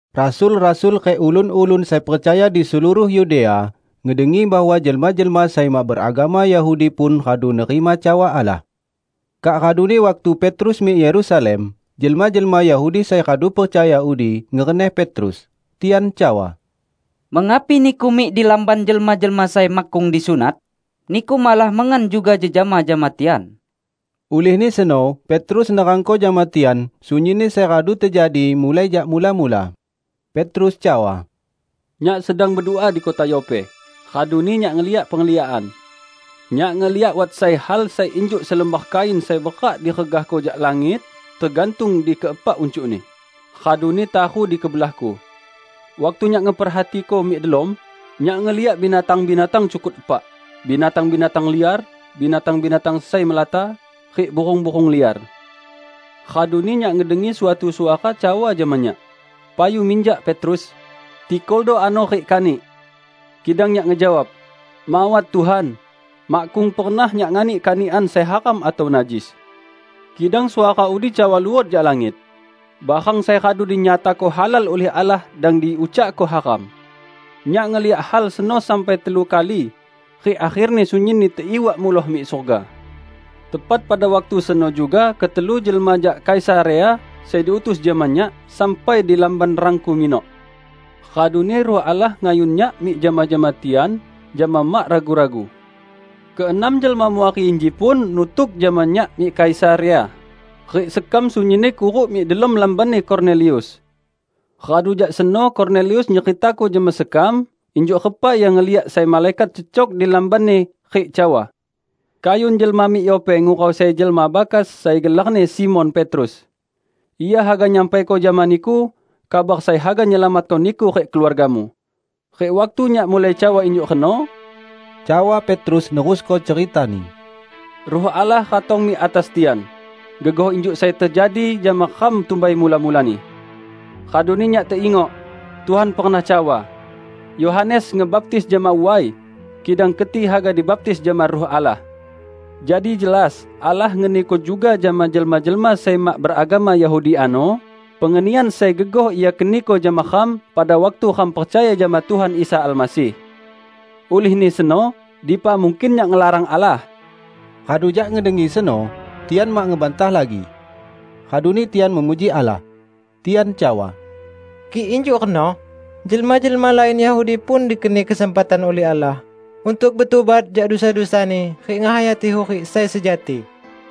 Rasul-rasul rik ulun-ulun sai percaya di seluruh Yudea ngedengi bahwa jelma-jelma sai mak beragama Yahudi pun radu nerima cawa Allah. Kak raduni waktu Petrus mik Yerusalem, jelma-jelma Yahudi sai radu percaya udi, ngereneh Petrus. Tian cawa, "Mengapi niku mik di lamban jelma-jelma sai makkung disunat? Niku malah mengan juga jejama jama tian!" Ulihni seno Petrus nerangko jama tian sunyinni sai radu tejadi, mulai jak mula-mula. Petrus cawa, "Nyak sedang bedua di kota Yope, raduni nyak ngeliak pengliakan. Nyak ngeliak wat sai hal sai injuk selembar kain sai berak diregahko jak langit, tegantung di keepak uncukni, raduni taru di kebelahku. Waktu nyak ngeperhatiko mik delom, nyak ngeliak binatang-binatang cukut epak, binatang-binatang liar, binatang-binatang sai melata, rik burung-burung liar. Raduni nyak ngedengi suatu suara cawa jama nyak, 'Payu minjak, Petrus! Tikoldo ano rik kanik!' Kidang nyak ngejawab, 'Mawat, Tuhan! Makkung pernah nyak nganik kanikan sai haram atau najis.' Kidang suara udi cawa luot jak langit, 'Barang sai radu dinyatako halal ulih Allah dang di ucakko haram.' Nyak ngeliak hal seno sampai telu kali rik akherni sunyinni teiwak muloh mik surga. Tepat pada waktu seno juga ketelu jelma jak Kaisarea, sai diutus jama nyak, sampai di lamban rangku minok. Raduni Ruh Allah ngayun nyak mik jama-jama tian jama mak ragu-ragu. Keenam jelma muari inji pun nutuk jama nyak mik Kaisarea, rik sekam sunyinni kuruk mik delom lambanni Kornelius. Radu jak seno Kornelius nyeritako jama sekam injuk repa ia ngeliak sai malaikat cecok di lambanni rik cawa, 'Kayun jelma mik Yope ngurau sai jelma bakas sai gelarni Simon Petrus. Ia haga nyampaiko jama niku kabar sai haga nyelamatko niku rik keluargamu.' Rik waktu nyak mulai cawa injuk reno," cawa Petrus nerusko ceritani, "Ruh Allah ratong mik atas tian, gegoh injuk sai tejadi jama ram tumbai mula-mulani. Raduni nyak teingok, Tuhan pernah cawa, 'Yohanes ngebaptis jama way, kidang keti haga dibaptis jama Ruh Allah.' Jadi jelas Allah ngeniko juga jama jelma-jelma sai mak beragama Yahudi ano, pengenian sai gegoh Ia keniko jama ram pada waktu ram percaya jama Tuhan Isa Almasih. Ulihni seno, dipa mungkin nyak ngelarang Allah!" Radu jak ngedengi seno, tian mak ngebantah lagi. Raduni tian memuji Allah. Tian cawa, "Kik injuk reno, jelma-jelma lain Yahudi pun dikeni kesempatan ulih Allah untuk betubat jak dusa-dusani rik ngehayati hurik sai sejati!"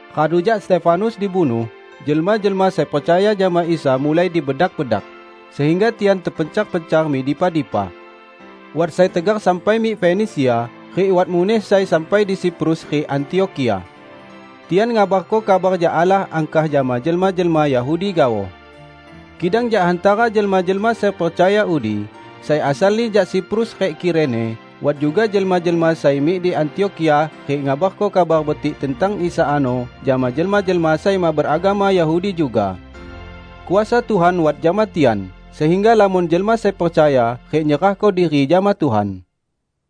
Radu jak Stefanus dibunuh, jelma-jelma sai percaya jama Isa mulai dibedak-bedak, sehingga tian terpencar-pencar mik dipa-dipa. Wat sai tegar sampai mik Fenisia, rik wat muneh sai sampai di Siprus rik Antiokhia. Tian ngabarko kabar jak Allah angkah jama jelma-jelma Yahudi gaoh. Kidang jak hantara jelma-jelma sai percaya udi, sai asalni jak Siprus rik Kirene, wat juga jelma-jelma sai mik di Antiokhia rik ngabarko Kabar Betik tentang Isa ano jama jelma-jelma sai mak beragama Yahudi juga. Kuasa Tuhan wat jama tian sehingga lamon jelma sai percaya rik nyerahko diri jama Tuhan.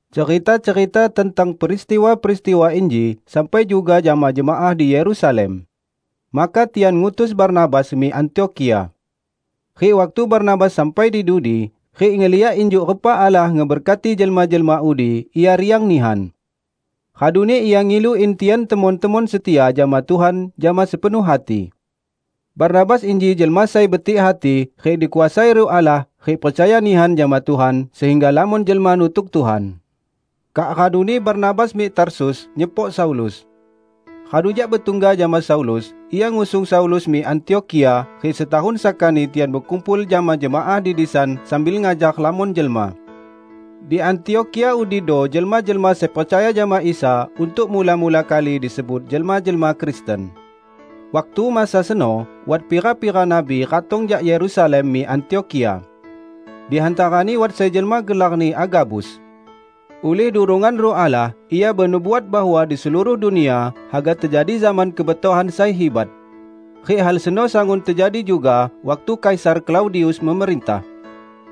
Cerita-cerita tentang peristiwa-peristiwa inji sampai juga jama jemaah di Yerusalem. Maka tian ngutus Barnabas mik Antiokhia. Rik waktu Barnabas sampai di dudi, rik ngeliak injuk repa Allah ngeberkati jelma-jelma udi, ia riang nihan. Raduni ia ngilu in tian temon-temon setia jama Tuhan jama sepenuh hati. Barnabas inji jelma sai betik hati rik dikuasai Ruh Allah rik percaya nihan jama Tuhan sehingga lamon jelma nutuk Tuhan. Kak raduni Barnabas mik Tarsus nyepok Saulus. Radu jak betungga jama Saulus, ia ngusung Saulus mik Antiokhia rik setahun sakani tian bekumpul jama jemaah di disan sambil ngajar lamon jelma. Di Antiokhia udido jelma-jelma sai percaya jama Isa untuk mula-mula kali disebut jelma-jelma Kristen. Waktu masa seno wat pira-pira nabi ratong jak Yerusalem mik Antiokhia. Di hantarani wat sai jelma gelarni Agabus. Ulih durongan Ruh Allah ia benubuat bahwa di seluruh dunia haga tejadi zaman kebetohan sai hibat. (Rik hal seno sangun tejadi juga waktu Kaisar Klaudius memerintah.)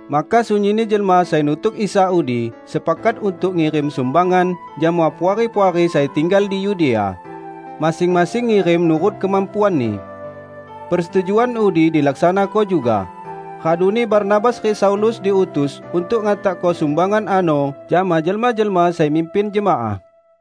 Maka sunyinni jelma sai nutuk Isa udi sepakat untuk ngirim sumbangan jama puari-puari sai tinggal di Yudea; masing-masing ngirim nurut kemampuanni. Persetujuan udi dilaksanako juga, raduni Barnabas rik Saulus diutus untuk ngantakko sumbangan ano jama jelma-jelma sai mimpin jemaah.